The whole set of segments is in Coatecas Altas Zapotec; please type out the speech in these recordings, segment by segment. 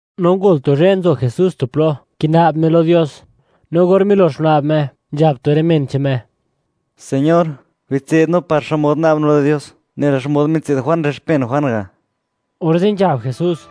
No ngol tu zhë, nzo Jesús tu plo, kina'b Me lo Dios; no or milox guna'b Me, nzhab tu rë men che'n Me: ―Señor, bitse'd no par xmod na'b no lo Dios, nela xmod mitse'd Juan rë xpen Juan ga'. Orze' nzhab Jesús: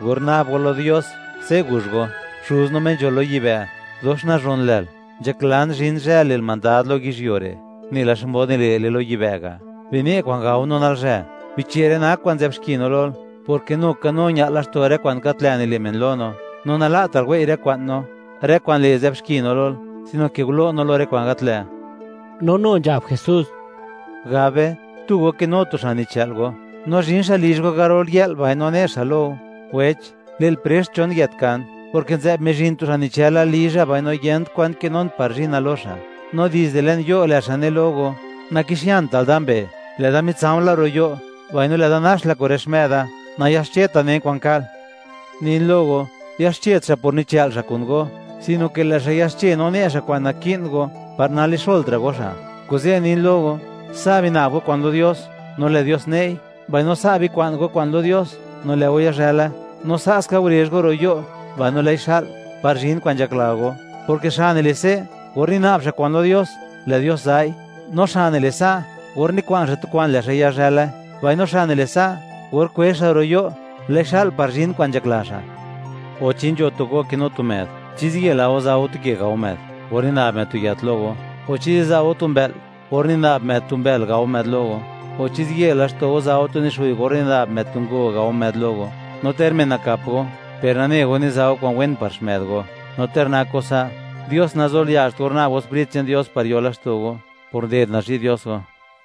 ―Or na'b go lo Dios, se' guzh go: Xuz no, Me nzho lo yibë', dox nazhon lël. Nzhaklan zhin zhë, le'l mandad lo yizhyuo re', nela xmod nile'le lo yibë' ga'. Bine' kwa'n gao no nalzhë. Biche' rë kwa'n nzë'b xki no lol, porke nu ka no ña'l laxto' rë kwa'n gat lë' nile' men lo no. No nala'tal wei' rë kwa'n no, rë kwa'n le', nzë'b xki no Lol, sino ke gulo' no lo rë kwa'n gat lë'. No nu nzhab Jesús: ―Gab be, tu go kinu tu xa' nichë'l go, no zhin xa' lizh go garol yë'l, mbaino ne xa' lo go: “Wech, le'l prext chon yët kan; porke nzë'b mizhin tu xa' nichëla lizha, mbaino yent kwa'n kinun par zhina lo xa'.” No dizde le'n yo', lë' xa' ne lo go: “Nakixiantal da mbee'; lë' da mitsa̱o̱ la ro' yo', mbaino lë'da nax la kun rë xmë'da, nayaxcheta' nen kwa'n ka'l.” Nin lo go, yaxchet xa' por nichë'l xa' kun go, sino ke lë' xa' yaxche no ne' xa' kwa'n naki'n go, par nalixolt ra' go xa'. Kuze' nin lo go, sa' bina'b go kwa'n lo Dios, no lë' Dios ne'i; mbaino sa' bikwa'n go kwa'n lo Dios, no lë' go yazhële; no sa' ska gurezh go ro' yo', mbaino lë'i xa'l, par zhin kwa'n nzhakla go, porke xa' nile' se' or nina'b xa' kwa'n lo Dios, lë' Dios za'i; no xa' nile' sa', or nikwa'n xa' tu kwa'n, lë' xa' yazhële; mbaino xa' nile' sa' or kwezh xa' ro' yo', lë'i xa'l par zhin kwa'n nzhakla xa'. ’O, ¿chi nzho tu go kinu tu më'd, chi ziye la go za' go tu ke gao më'd, or nina'b më'd tu yët lo go? O, ¿chi ziza' go tu mbë'l, or nina'b më'd tu mbël gao më'd lo go? O, ¿chi ziye laxto' go za' go tu nixguy or nina'b më'd tu ngo, gao më'd lo go? No ter men nakap go, per nane go niza' go kwa'n wen, par xmë'd go; no ter nak go sa', ¡Dios nazolia'zht (le't Dios naya') or na'b go Sprit che'n Dios par yo laxto' go, por nded nazhi' Dios go!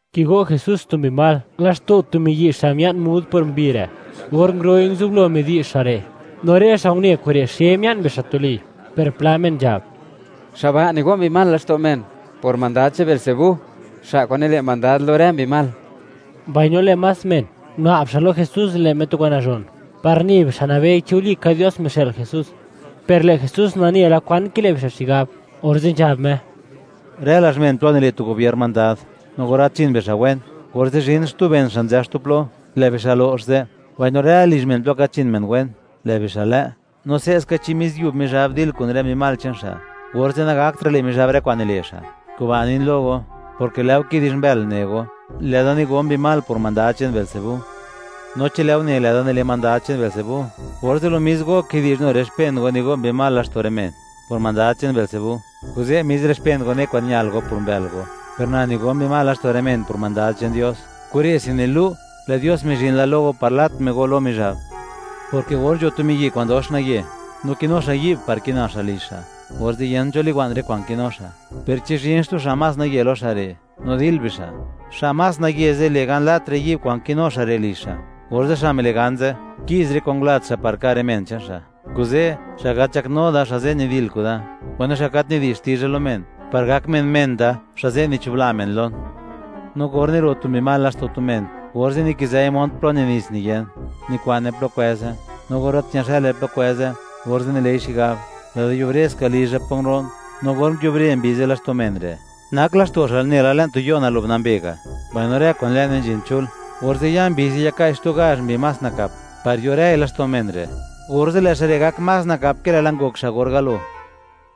Kigo' Jesús tu mbi mal, laxto' tu miyi' xa' mia'n mud por mbi re'. Or nguro'i, nguzublo midi'zh xa' re', no rë xa' une kure', xe mia'n bixa' tuli. Per pla men nzhab: ―Lë' xa' ba' nigo' mbi mal laxto' men, por mandad che'n Beelzebú, xtu lë Mizhab, xa' kwa'n nile' mandad lo rë mbi mal. Mbaino lë' más men, guna'b xa' lo Jesús, le' Me tu kwa'n nazhon, par ne bixa', nabei, chi walika Dios mixë'l Jesús. Per lë' Jesús nane la, kwan kile' bixa' xigab, orze' nzhab Me: ―Rë lazh men plo nile' tu gobier mandad, no or gat nzhin bixa' wen, orze' zhin xtu ben xa' nzë xtu plo, lë' bixa' lo'x ze'; mbaino rë lizh men plo gat nzhin men wen, lë' bixa' lë'. No se'ska, chi mis yub Mizhab, dil kun rë mbi mal che'n xa', orze', nagaktra' le' Mizhab rë kwa'n nile' xa'. Kuba' nin lo go, porke lë' go kidi'zh mbël, ne go, lë'da nigo' mbi mal, por mandad che'n Beelzebú. No chi lë' go ne, lë' da nile' mandad che'n Beelzebú, orze', lo mis go kidi'zh nu rë xpen go, nigo' mbi mal laxto' rë men, por mandad che'n Beelzebú. Kuze' mis rë xpen go ne kwan ñal go, por mbël go. Per na nigo mbi mal laxto' rë men por mandad che'n Dios; kure'se nilu', lë' Dios mizhin la lo go par lat Me go lo Mizhab, porke or nzho tu miyi' kwa'n dox naye, no kinu xa' yi'b par kina xa' lizh xa', orze' yent cho liwa'n rë kwa'n kinu xa'. Per chi zhin xtu xa' más naye lo xa' re', no dil bixa'; xa' más naye ze' le' gan, lat rë yi'b kwa'n kinu xa' re' lizh xa', orze' xa' mile' gan ze', ki'z rë kwa'n ngulat xa' par ka' rë men che'n xa'. ’Kuze', xa' gat nzhaknu da, xa' ze' nidil kuda; mbaino xa' gat nidi'zh xtizha lo men, par gak men, men da, xa' ze' nichubla men lon. ’No or niro' tu mbi mal laxto' tu men, orze' nikizëi mont plo ni nits niyen, nikwa'ne plo kwëze; no or gat ñayazhële plo kwëze, orze' nile'i xigab: “Lë'da yubre ska lizha plo nguro'n.” No or nguiubre mbi ze' laxto' men re', nak laxto' xa' nela le'n tu yo', nalo'b nambe ga', mbaino rë kwa'n le'ne nzhin chul, orze' ya mbi ze', yaka'i xtu gazh mbi más nakap, par yo rëi laxto' men re'; orze' lë' xa' re' gak más nakap, ke lë'la ngok xa' or galo.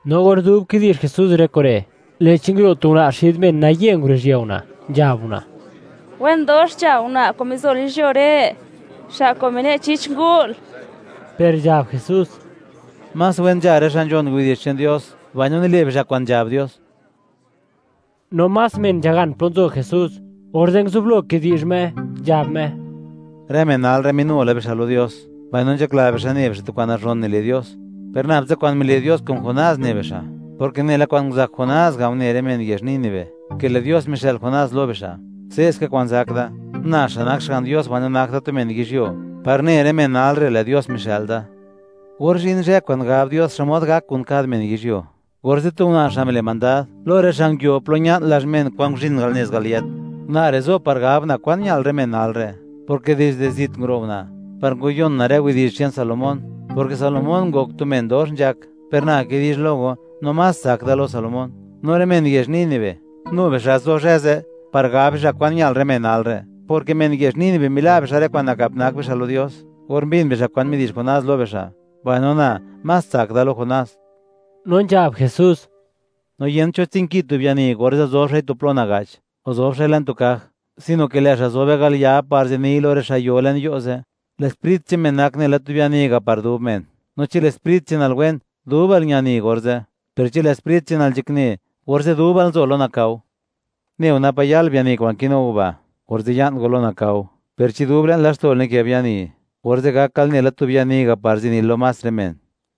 No or dub kidi'zh Jesús rë kure', lë'chi nguro' tu una' xid men, naye nguruzhië una', nzhab una': ―¡Wen dox nzha una' kwa'n mizol yizhyuo re', xa' kwa'n mine' chich ngu'l! Per nzhab Jesús: ―¡Más wen nzha rë xa' nzhon widi'zh che'n Dios, mbaino nile' bixa' kwa'n nzhab Dios! No más men nzhagan plo nzo Jesús, orze' nguzublo kidi'zh Me, nzhab Me: ―Rë men nal re', minu la bixa' lo Dios, mbaino nzhakla bixa', ne bixa' tu kwa'n nazhon nile' Dios, per nab tsa kwa'n mile' Dios kun Jonás ne bixa', porke nela kwa'n nguzak Jonás ga' une rë men yezh Nínive, ke lë' Dios mixë'l Jonás lo bixa', se'ska kwa'n zak da, na xa' nak Xga'n Dios mbaino nak da tu men yizhyuo, par ne rë men nal re', lë' Dios mixë'l da. Or zhin zhë kwa'n gab Dios, xmod gak kun kad men yizhyuo, orze' tu una' xa' mile' mandad, lo rë xa' nguio plo ña'n lazh men, kwa'n nguzhin al nez al yët, una' re' zo par gab una' kwan ñal rë men nal re'; porke dizde zit nguro' una', par ngwayon una' rë widi'zh che'n Salomón, porke Salomón ngok tu men dox nzhak. Per na kidi'zh lo go, no más tsak da lo Salomón. No rë men yezh Nínive, nu bixa' zo zhë ze', par gab bixa' kwan ñal rë men nal re', porke men yezh Nínive mila' bixa' rë kwa'n nakap nak bixa' lo Dios, or mbin bixa' kwa'n midi'zh Jonás lo bixa', mbaino na, más tsak da lo Jonás. No nzhab Jesús: ―No yent cho tsinki tu biani, orze' zob xa'i tu plo naga'ch, o zob xa'i le'n tu kaj; sino ke lë' xa' zobe al ya, par ziniy lo rë xa' yo le'n yo' ze'. Lë' sprit che'n men nak nela tu biani ga' par dub men. No chi lë' sprit che'nal wen, dubal ñani orze'; per chi lë' sprit che'nal nzhakne, orze' dubal nzo lo nakao. Neo, napa' yal biani kwa'n kinu go ba', orze' ya'n go lo nakao. Per chi dub le'n laxto'l nikë biani, orze' gakal nela tu biani ga' par zinil lo más rë men.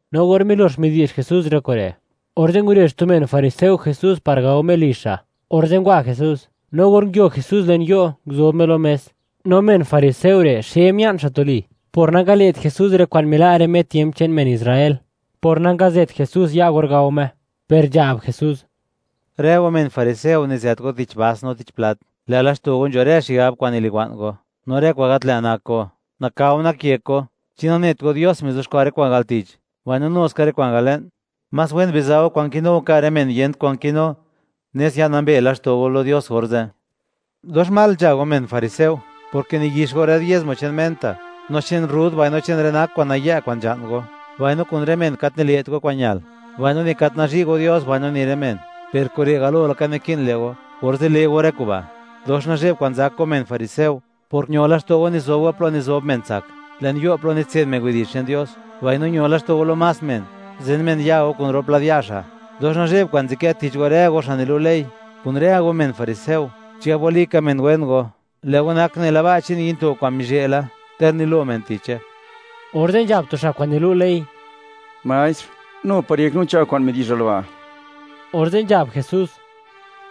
No or milox midi'zh Jesús rë kure', orze' ngurezh tu men fariseo Jesús par gao Me lizh xa'. Orze' ngwa Jesús. No or nguio Jesús le'n yo', nguzob Me lo mes. No men fariseo re', xe mia'n xa' tuli por nangale't Jesús rë kwa'n mila' rë me tiemp che'n men Israel, por nangazët Jesús ya' Me or gao Me, per nzhab Jesús: ―Rë go men fariseo, nizët go tich bas no tich plat, lë' laxto' go nzho rë xigab kwa'n niliwa'n go, no rë kwa'n gat lë' nak go. ¡Nakao nak yek go! ¿Chi nanet go, Dios mizuxkwa' rë kwa'n al tich, mbaino nu ska rë kwa'n al le'n? Más wen biza' go kwa'n kinu go, ka' rë men yent kwan kinu, nes ya'n nambe laxto' go lo Dios orze'. ’¡Dox mal nzha go, men fariseo!, porke niyix go rë diezmo che'n menta, no che'n rrud, mbaino che'n rë nak kwa'n nayë', kwa'n nzha'n go; mbaino kun rë men gat nile't go kwa'n ñal, mbaino ni gat nazhi' go Dios mbaino ni rë men. Per kure' galo laka naki'n le' go, orze' le' go rë kuba'. ’¡Dox nazhe'b kwa'n zak go, men fariseo!, porke ño laxto' go, nizob go plo nizob men tsak, le'n yo' plo nitse'd men widi'zh che'n Dios, mbaino ño laxto' go, lo más men, zen men ya' go, kun rop lad ya' xa'. ’¡Dox nazhe'b kwa'n nzadkë tich go, rë go xa' nilu' ley, kun rë go men fariseo, chigab walika men wen go! Lë' go nak nela ba' che'n yinto' kwa'n mizhë' la, ter nilo men tiche. Orze' nzhab tu xa' kwa'n nilu' ley: ―Maestr, nu par yek no nzha kwa'n midi'zhal ba'. Orze' nzhab Jesús: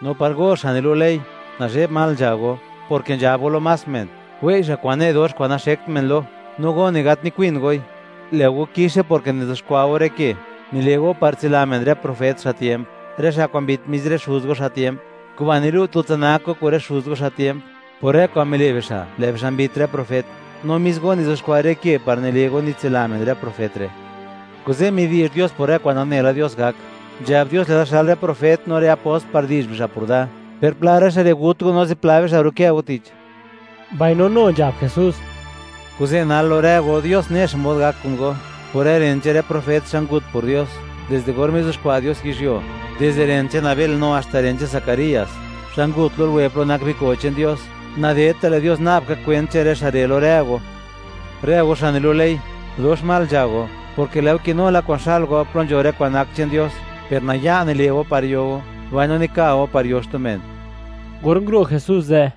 ―¡Nu par go, xa' nilu' ley, nazhe'b mal nzha go!, porke nzhab go lo más men, wei' xa' kwa'n ne' dox, kwa'n naxekt men lo; no go, ni gat nikwin goi. ’¡Lë' go kixe!, porke nizuxkwa' go rë ke, nile' go par tsila men rë profet, xa' tiemp, rë xa' kwa'n mbit mis rë xuz go xa' tiemp. Kuba', nilu' tutsa nak go kun rë xuz go, xa' tiemp, por rë kwa'n mile' bixa'; lë' bixa' mbit rë profet, no mis go nizuxkwa' rë ke par nile' go nitsila men rë profet re'. Kuze', midi'zh Dios por rë kwa'n nane la Dios gak, nzhab Dios: “Lë'da xël rë profet, no rë apost, par di'zh bixa' por Da, per pla rë xa' re' gut go, no zipla bixa' rukë go tich.” Mbaino nu nzhab Jesús: —Kuze' nal, lo rë go, Dios ne xmod gak kun go, por rë ren che'n rë profet, xa' ngut por Dios, dizde or mizuxkwa' Dios yizhyuo, dizde ren che'n Abel no haxta ren che'n Zacarías, xa' ngut lo luwe plo nak biko' che'n Dios, nadedta' lë' Dios na'b ka kwent che'n rë xa' re', lo rë go. ’Rë go xa' nilu' ley, ¡dox mal nzha go!, porke lë' go kinu la kwa'n xa'l go, plo nzho rë kwa'n nak che'n Dios, per naya' nile' go par yo go, mbaino nika go par yo xtu men. Or nguro' Jesús ze',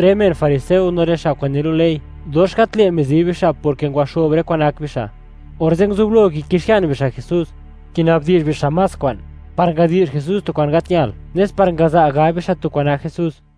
rë men fariseo no rë xa' kwa'n nilu' ley, dox gat lë' mizi bixa', porke ngwaxo'b rë kwa'n nak bixa', orze' nguzublo kikixian bixa' Jesús, kinabdi'zh bixa' más kwa'n, par ngadi'zh Jesús tu kwa'n gat ñal, nes par ngaza' gab bixa' tu kwa'n nak Jesús.